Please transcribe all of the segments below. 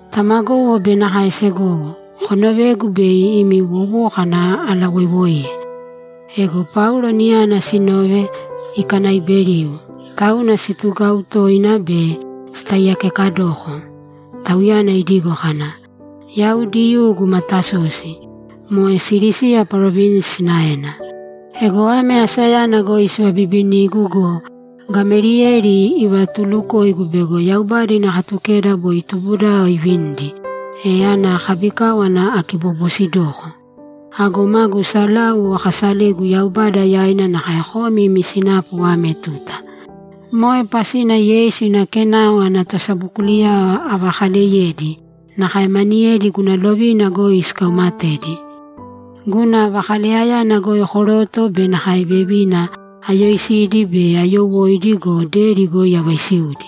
‘Tamagowo be nakae segowo, konovēgu bei imi wowókana alawoiwoiye.’ Ego Paulo niyana sinove ikanaaiberiu, tauna situgau toina be sitaiyakekedoko. Tauyana idigo kana, ‘Yau Diyuu guma Tasosi, moe Silisiya parovinsi sinaena. Ego ame asayana goi sivabibinigu go, Gameliyeli ivatulukoigu bego Yaubada ina Katukeda boi tubudao ivinidi, e ana kabikáwana akibobosidoko. Ago magu salau akasalegu Yaubada yaina nakae komi imi sinapu ame tuta. Moe pasina Yeisu ina Kenao ana tosabokuliyao avakaleyedi, nakae maniyedi guna lovina goi sikaumatedi. Guna vakaleyayana goi koroto be nakae vevina, ayoisidi be ayowóidi go, deri goi avaisiudi.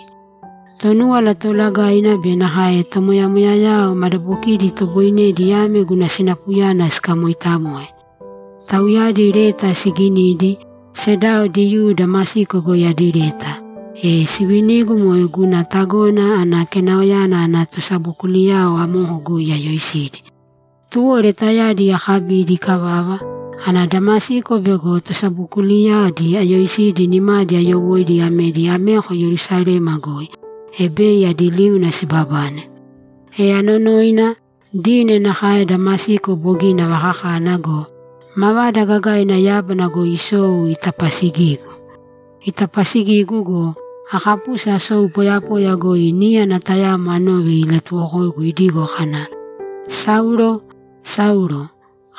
Tonúwala Toolagaina be nakae tomoyamoyayao madabokidi itoboinedi ame guna sinapuyana sikamoitamoe. Tauyadi leta siginidi, sedao Diyuu Damasiko goi adi leta, e sivinigu moe guna tagona ana Kenaoyana ana tosabokuliyao amoko goi ayoisidi. Tuwo letayadi akabidi ikavava, ana Damasiko bego tosabokuliyadi ayoisidi nimadi ayowóidi amedi ameko Yerusalema goi, e bei adi liuna sibabane. E anonoina, dine nakae Damasiko bogina avakakana go, mavada gagaina yábana goi isou itapasigigu. Itapasigigu go, akapusi asou poyapoya goi níyana tayamo anove ilatuwokoigu idigo kana, “Saulo, Saulo,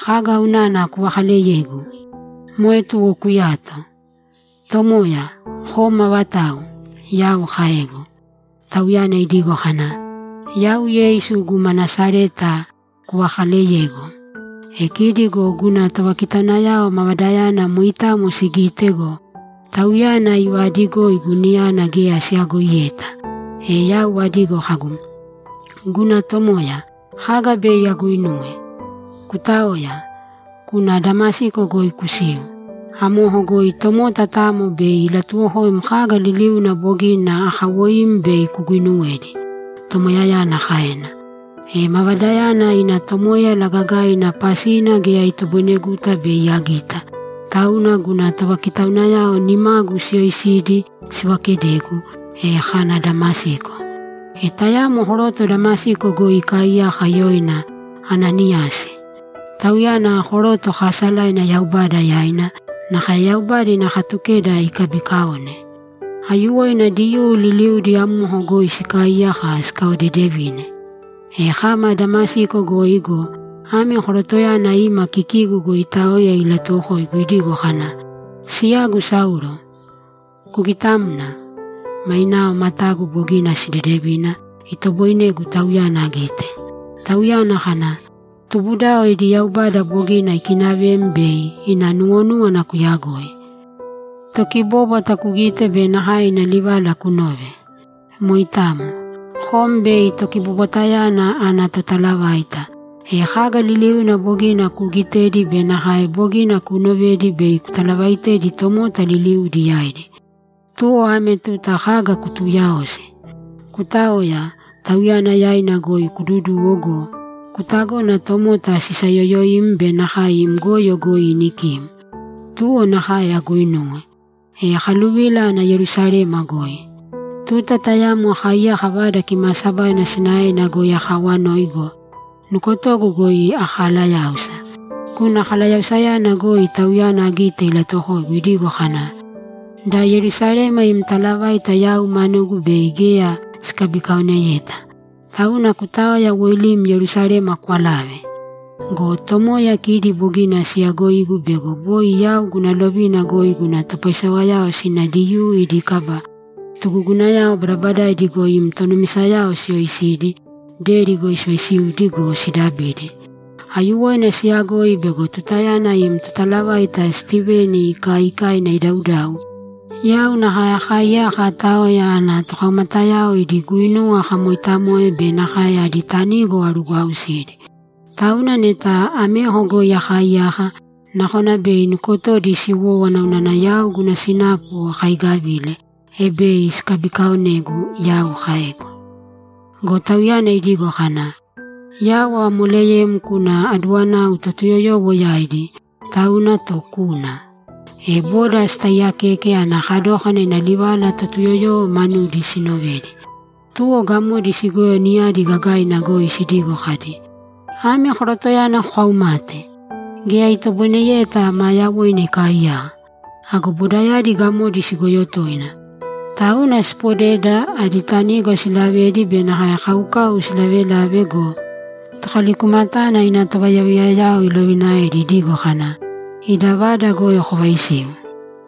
kaga unana kuvakaaleyegu? Moe tuwo kuyāto!” “Tomoya, kom avatau?” Yau kaegu. Tauyana idigo kana, “Yau Yeisu guma Nasareta kuvakaaleyegu.” E kidi go guna tovakitaunayao mavadayana moitamo sigite go, Tauyana ivaadigoigu niyana geya siyagoiyeta. E yau adigo kagu, “Guna Tomoya, kaga bei aguinuwe?” “Kutāoya, kūna Damasiko goi kusīu. Amoko goi tomota tamo bei ilatuwokoim kaga liliuna bogina akawoim bei kuguinuwedi”, Tomoyayana kaena. E mavadayana ina tomoéyala gagaina pasina geya itoboineguta bei agita, tauna guna tovakitaunayao nimagu siyoisidi sivakedegu, e kana Damasiko. E tayamo koroto Damasiko goi ikaaiyaka yoina Ananiyasi. Tauyana koroto kaasalaina Yaubada yaina, nakae Yaubada ina Katukeda ikabiikaone. Aiyuwoina Diyuu liliudi amoko goi sikaaiyaka sikaodeedevine. E kama Damasiko goi go, ame korotoyana ima kikigu goi itaoya ilatuwokoigu idigo kana, “Siyagu Saulo, kugitāmna!” Mainao matagu bogina sidedevina, itoboinegu tauyana agite. Tauyana kana, “Tubudao idi Yaubada bogina ikinavem bei ina nuwonúwana kuyagoi, Tokibóbwata kugite be nakae ina livala kunove. Moitamo. Kom bei Tokibobwatayana ana totalavaita; e kaga liliuna bogina kuugitedi be nakae bogina kuunovedi bei kutalavaitedi tomota liliudi yaidi. Tuwo ame tuta kaga kutuuyaosi? Kutāoya, Tauyana yaina goi kududūwo go, kutagōna tomota sisayoyoim be nakae im goyo goi inikim.” Tuwo nakae aguinuwe. E akaluvila ana Yerusalema goi. Tuta tayamo akaaiyaka Vada Kimaasabaina sinaena goi akaawanoi go, nukotogu goi akalayáusa. Guna kalayausayana goi Tauyana agite ilatuwokoigu idigo kana, “Da Yerusalema im talavaita yau manugu bei geya sikabikaoneyeta, tauna kutāoya woilīm Yerusalema kwalāve.” “Go Tomoya, kidi bogina siyagoigu bego boi yau guna lovina goi guna topaisewayao sina Diyuu idi kaba tugugunayao badabadaidi goi im tonumisayao siyoisidi, deri goi sivaisiudi go, sidabidi. Aiyuwoina siyagoi bego tutayana im totalavaita Stiveni ikaikaina idaudau, yau nakae akaiyaka aataoya ana tokaumatayao idi guinuwa akamoitamoe be nakae adi tanigo arugwausidi. Tauna neta ameko goi akaaiyaka, nakona bei nukotodi siwówana unana yau guna sinapu akaigavile, e bei sikabikaonegu”, yau kaegu. Go Tauyana idigo kana, “Yau avamoleyem kuna aduwanau Totuyoyowo yaidi, tauna, to kūna.”’ E boda sitaaiyakeke ana kadókana ina livala Totuyoyowo manudi sinovedi. Tuwo gamodi sigoyo niyadi gagaina goi sidigo kadi, ‘Ame korotoyana kokaumate! Geya itoboineyeta maa yawoina ikaaiyaka.’ Ago bodayadi gamodi sigoyo toina, tauna siipodeda, adi tanigo siilavedi be nakae kaukau silavelave go, tokalikumatana ina tovayaviyayao ilovinaedi idigo kana, ‘Ida vada goi kovaisīu.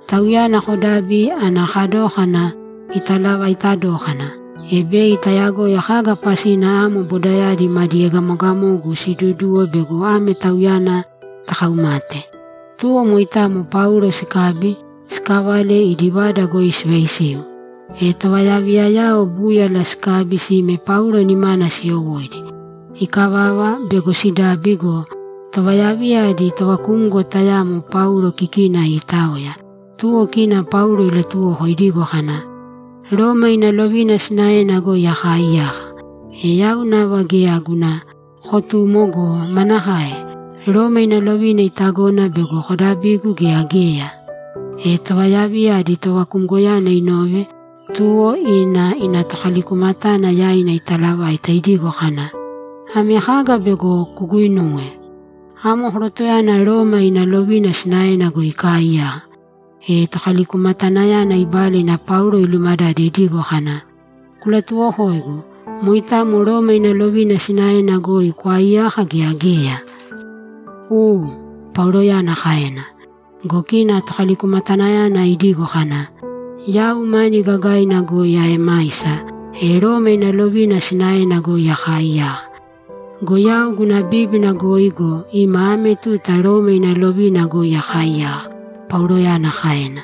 Tauyana kodābi ana kadókana italavaita dókana, e bei tayagoi kaga pasina amo bodayadi madi egamogamogu siiduduwo bego ame tauyana takaumate.’ Tuwo moitamo Paulo sikabi, sikavale idi vada goi sivaisiu. E tovayaviyayao búyala sikabi sime Paulo nimana siyowóidi. Ikavava, bego sidabi go, tovayaviya adi tovakumgo tayamo Paulo kikina iitaoya, tuwo kina Paulo ilatuwoko idigo kana, ‘Roma ina lovina sinaena goi akaaiyaka. E yau nava geya guna kotumo go, manakae? Roma ina lovina itagona bego kodabigu gea geya?’ E tovayaviya adi tovakumgoyana inove, tuwo ina ina tokalikumatana yaina italavaita idigo kana, ‘Ame kaga bego kuguinuwe? Amo korotoyana Roma ina lovina sinaena goi ikaaiyaka!’ E tokalikumatanayana ibala ina Paulo ilumadade idigo kana, ‘Kulatuwokōigu, moitamo Roma ina lovina sinaena goi kwaaiyaka gea geya?’ ‘U’, Pauloyana kaena. Go kina tokalikumatanayana idigo kana, ‘Yau mani gagaina goi aemaisa, e Roma ina lovina sinaena goi akaaiyaka.’ ‘Go yau guna bíbina goi go, ima ame tuta Roma ina lovina goi akaaiyaka’, Pauloyana kaena.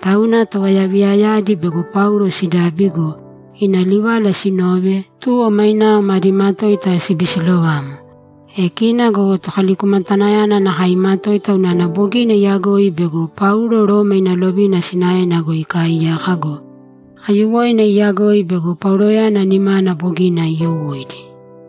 Tauna tovayaviyayadi bego Paulo sidabi go, ina livala sinove, tuwo mainao madi matoita sibisilovamo. E kina go tokalikumatanayana nakae imatoita unana bogina iyagoi bego Paulo Roma ina lovina sinaena goi ikaaiyaka go, aiyuwoina iyagoi bego Pauloyana nimana bogina iyowóidi!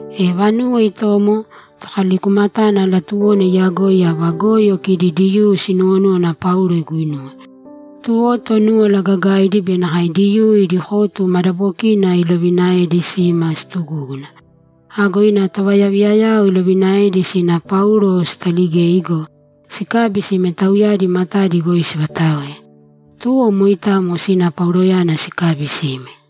E vanuwo itomo, tokalikumatana latuwona iyagoi ava goyo kidi Diyuu sinuwonúwana Paulo iguinuwe. Tuwo Tonúwala Gagaidi be nakae Diyuu idi kotu madabokina ilovinaedi sima situgúguna. Ago ina tovayaviyayao ilovinaedi sina Paulo sitaligei go, sikabi sime tauyadi matadi goi sivataoe. Tuwo moitamo sina Pauloyana sikabi sime.